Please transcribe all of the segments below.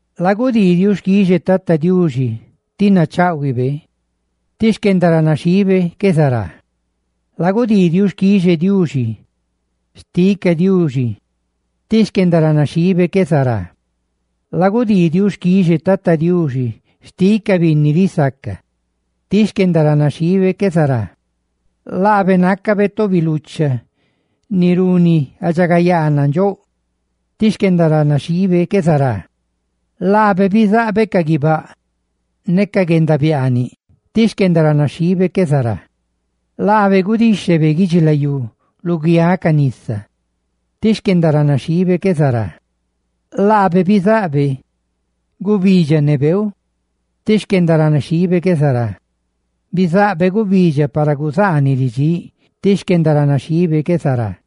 Lagudii xquixe Tata Diuxi, ti nachaꞌhuibe, tí xquendaranaxhiibe qué zará. Lagudii xquixe Diuxi xtiꞌ ca bidóꞌ, tí xquendaranaxhiibe qué zará. Lagudii xquixe Tata Diuxi xtiꞌ ca binni risaca, tí xquendaranaxhiibe qué zará. Laabe nácabe tobi lucha ni runi guendaridxagayaa nandxóꞌ, tí xquendaranaxhiibe qué zará. Laabe bizaꞌbe ca guibáꞌ ne guendabiaaniꞌ, tí xquendaranaxhiibe qué zará. Laabe gudíxhebe guidxilayú luguiáꞌ ca nisa, tí xquendaranaxhiibe qué zará. Laabe bizaꞌbe gubidxa ne beeu, tí xquendaranaxhiibe qué zará; bizaꞌbe gubidxa, ni guzaaniꞌ ridxíꞌ, tí xquendaranaxhiibe qué zará;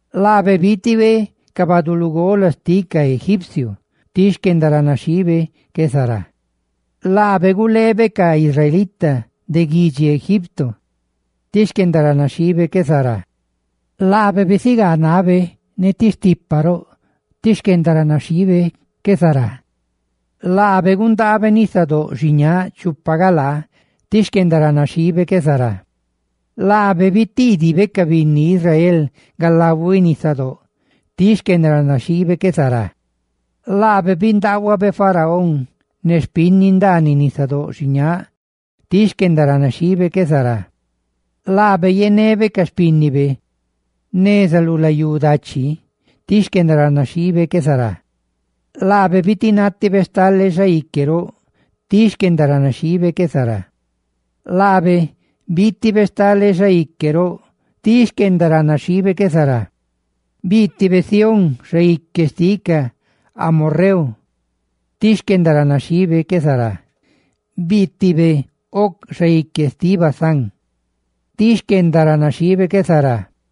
Laabe biitibe ca baꞌduꞌ lugola xtiꞌ ca egipcio, tí xquendaranaxhiibe qué zará. Laabe guleebe ca israelita de guidxi Egipto, tí xquendaranaxhiibe qué zará; laabe bisigaa nabe ne ti stipa roꞌ, tí xquendaranaxhiibe qué zará. Laabe gundaabe nisadóꞌ xiñáꞌ chupa galaa, tí xquendaranaxhiibe qué zará. Laabe bitiidibe ca binni Israel galahuiꞌ nisadóꞌ, tí xquendaranaxhiibe qué zará. Laabe bindaahuabe Faraón ne xpinni ndaaniꞌ nisadóꞌ xiñáꞌ, tí xquendaranaxhiibe qué zará. Laabe yenebe ca xpínnibe neza lu layú dachi, ti xquendaranaxhiibe qué zará. Laabe bitinátibe stale xaique roꞌ, tí xquendaranaxhiibe qué zará. Laabe biitibe stale xaique roꞌ, tí xquendaranaxhiibe qué zará. Biitibe Sihón, xaique xtiꞌ ca amorreu, tí xquendaranaxhiibe qué zará; biitibe Og, xaique xtiꞌ Basán, tí xquendaranaxhiibe qué zará.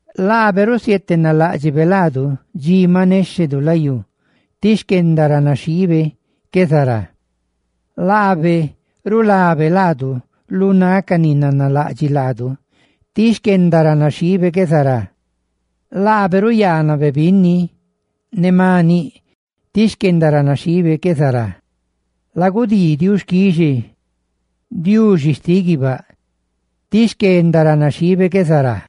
Laabe bietenaláꞌdxibe laanu dxi maꞌ néxhenu layú, tí xquendaranaxhiibe qué zará. Laabe rulabe laanu lu náꞌ ca ni nanalaꞌdxiꞌ laanu, tí xquendaranaxhiibe qué zará. Laabe ruyaanabe binni ne maniꞌ, tí xquendaranaxhiibe qué zará. ¡Lagudii xquixe Diuxi xtiꞌ guibáꞌ, tí xquendaranaxhiibe qué zará!